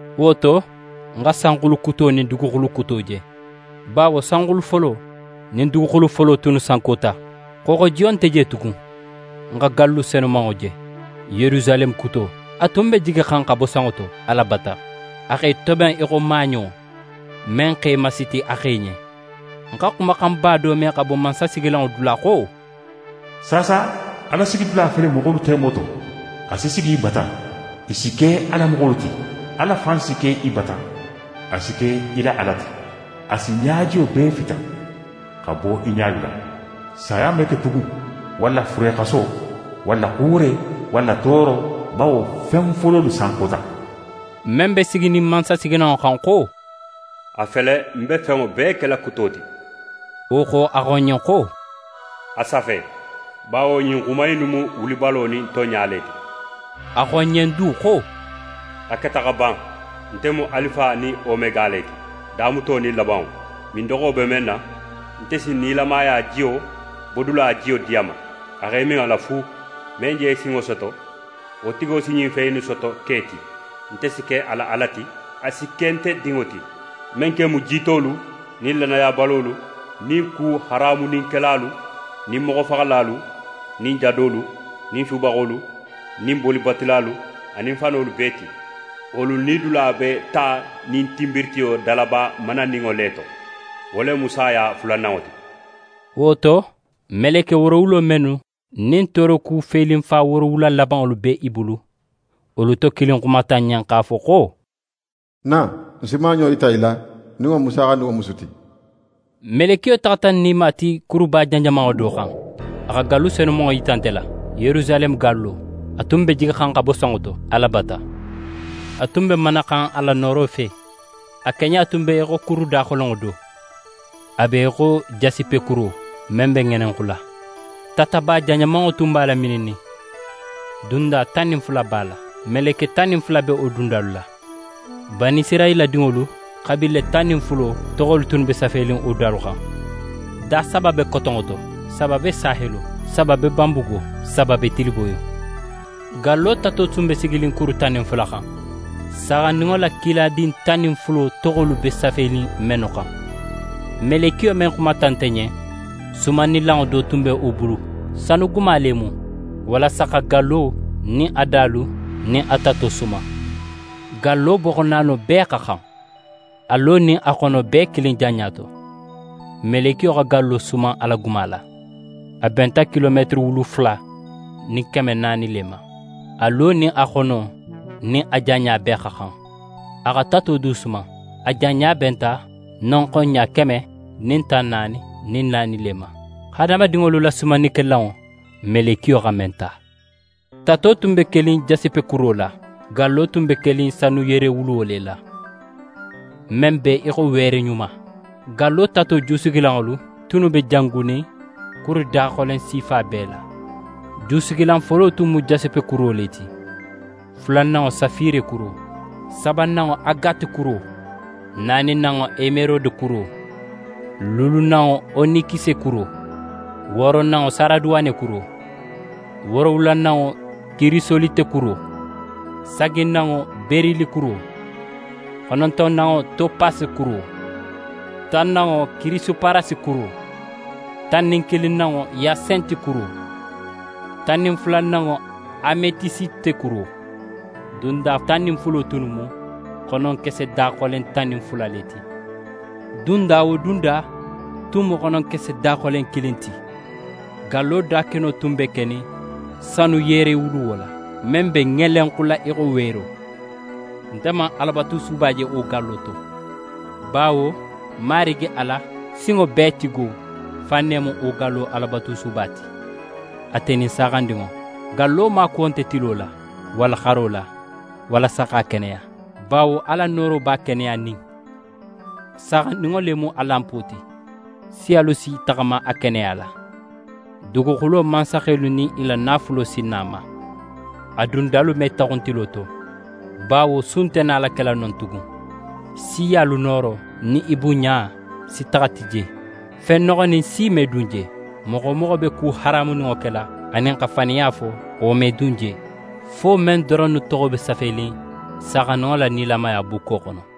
Wo to, ń xa sanxulu kuto nin duguxulu kuto je, bawo sanxulu folo nin duguxulu folo tunnu sankota. Xooxojiyo nte je tugun. Ń xa gallu senumanŋo je, Yerusaleme kuto, a tun be jigixan xa bo sanŋo to, Ala bata. A x'é toben í xo maaɲo men x'é masiti a xe ɲen. Ń xa xumaxanba do me xa bo mansasigilanŋo dula xo: «Saasa Ala sigidula fele moxolu temo to! A si sigi i bata, i si ke a la moxolu ti. Ala fan si ke i bata, a si ke i la Ala ti. A si ɲajiyo bee fita x'a bo i ɲalu la. Saya me ke tugun, walla furexaso, walla xuure, walla tooro, bawo fen fololu sankota.» Men be siginin mansasigilanŋo xan xo: «A fele ń be fenŋo bee kela kuto ti.» Wo xo, a xo ń ɲen xo: «A safe, bawo ɲin xuma innu mu wulibalo nin tonɲa le ti.» A xo ń ɲen du xo: «A keta xa ban! Nte mu Alifa nin Omega le ti, damuto nin labanŋo. Mindoxo be men na, nte si nilamaya jiyo bodula jiyo di a ma a x'é min a la fu. Men je sinŋo soto, wo tigo si ɲin fen innu soto ke ti; nte si ke a la Ala ti, a si ke nte dinŋo ti. Men ken mu jiitolu nin lannayabalolu, nin ku haramuninkelalu, nin moxofaxalalu, nin jadolu, nin subaxolu, nin bolibatulalu, anin fanolu bee ti, wolu nidula be ta nin tinbiritiyo dalaba mananinŋo le to. Wo le mu saya fulananŋo ti.» Wo to, meleke woorowulo mennu nin tooroku felinfa woorowula labanŋolu be i bulu, wolu to kilin xumata ń ɲen x'a fo xo: «Na, ń si maaɲo yita í la, nin wo mu Saaxandinŋo musu ti.» Melekiyo taxata ń nima ti kuruba janjamanŋo do xan. A xa gallu senumanŋo yita nte la, Yerusaleme gallo, a tun be jigixan xa bo sanŋo to, Ala bata. A tun be manaxan Ala nooro fe. A keɲa tun be í xo kuru daxolenŋo do, a be í xo jasipekuro men be ŋelenxula. Tataba janjamanŋo tun b'a lamininnin. Dunda tan nin fula b'a la. Meleke tan nin fula be wo dundalu la. Banisirayila dinŋolu xabiile tan nin fulo toxolu tunnu be safenin wo dalu xan. Da saba be kotonŋo to, saba be sahelo, saba be banbugo, saba be tiliboyo. Gallo tato tun be siginin kuru tan nin fula xan, Saaxandinŋo la kiladin tan nin fulo toxolu be safenin mennu xan. Melekiyo men xumata nte ɲen, sumannilanŋo do tun be wo bulu, sanuguma le mu, walasa xa gallo nin a dalu nin a tato suman. Gallo boxo naano bee xa xan, a lo nin a xono bee kilin janɲa to. Melekiyo xa gallo suman a la guma la. A benta kilometere wulu fula nin keme naani le ma. A lo nin a xono nin a janɲa bee xa xan. A xa tato du suman. A janɲa benta nonxon ɲa keme nin tan naani nin naani le ma, hadamadinŋolu la sumannikelanŋo, melekiyo xa men ta. Tato tun be kenin jasipekuro la, gallo tun be kenin sanu yerewuluwo le la, men be í xo weere ɲuma. Gallo tato jusigilanŋolu tunnu be jangunin kuru daxolen sifa bee la. Jusigilan folo tun mu jasipekuro le ti, fulananŋo safirekuro, sabananŋo agatekuro, naaninanŋo emerodekuro, luulunanŋo onikisekuro, wooronanŋo saraduwanekuro, woorowulananŋo kirisolitekuro, saginanŋo berilikuro, xonontonanŋo topasekuro, tannanŋo kirisoparasekuro, tan nin kilinnanŋo yasentikuro, tan nin fulananŋo ametisitekuro. Dunda tan nin fulo tunnu mu xononkese daxolen tan nin fula le ti. Dunda wo dunda tun mu xononkese daxolen kilin ti. Gallo dakeno tun be kenin sanu yerewuluwo la, men be ŋelenxula í xo weero. Nte man Alabatusuba je wo gallo to, bawo Marigi Ala Sinŋobeetigo fan ne mu wo gallo Alabatusuba ti, ate nin Saaxandinŋo. Gallo maakuwo nte tilo la, walla xaro la, walasa x'a keneya, bawo Ala nooro b'a keneyanin, Saaxandinŋo le mu a lanpo ti. Siyalu si i taxama a keneya la, duguxulo mansaxelu nin i la naafulo si na a ma. A dundalu me taxun tilo to, bawo su nte nala kela non tugun. Siyalu nooro nin i bunɲa si taxa ti je. Fen noxonin si me dun je. Moxo wo moxo be ku haramuninŋo kela anin xa faniya fo, wo me dun je, fo men doronnu toxo be safenin Saaxandinŋo la nilamaya bukko xono.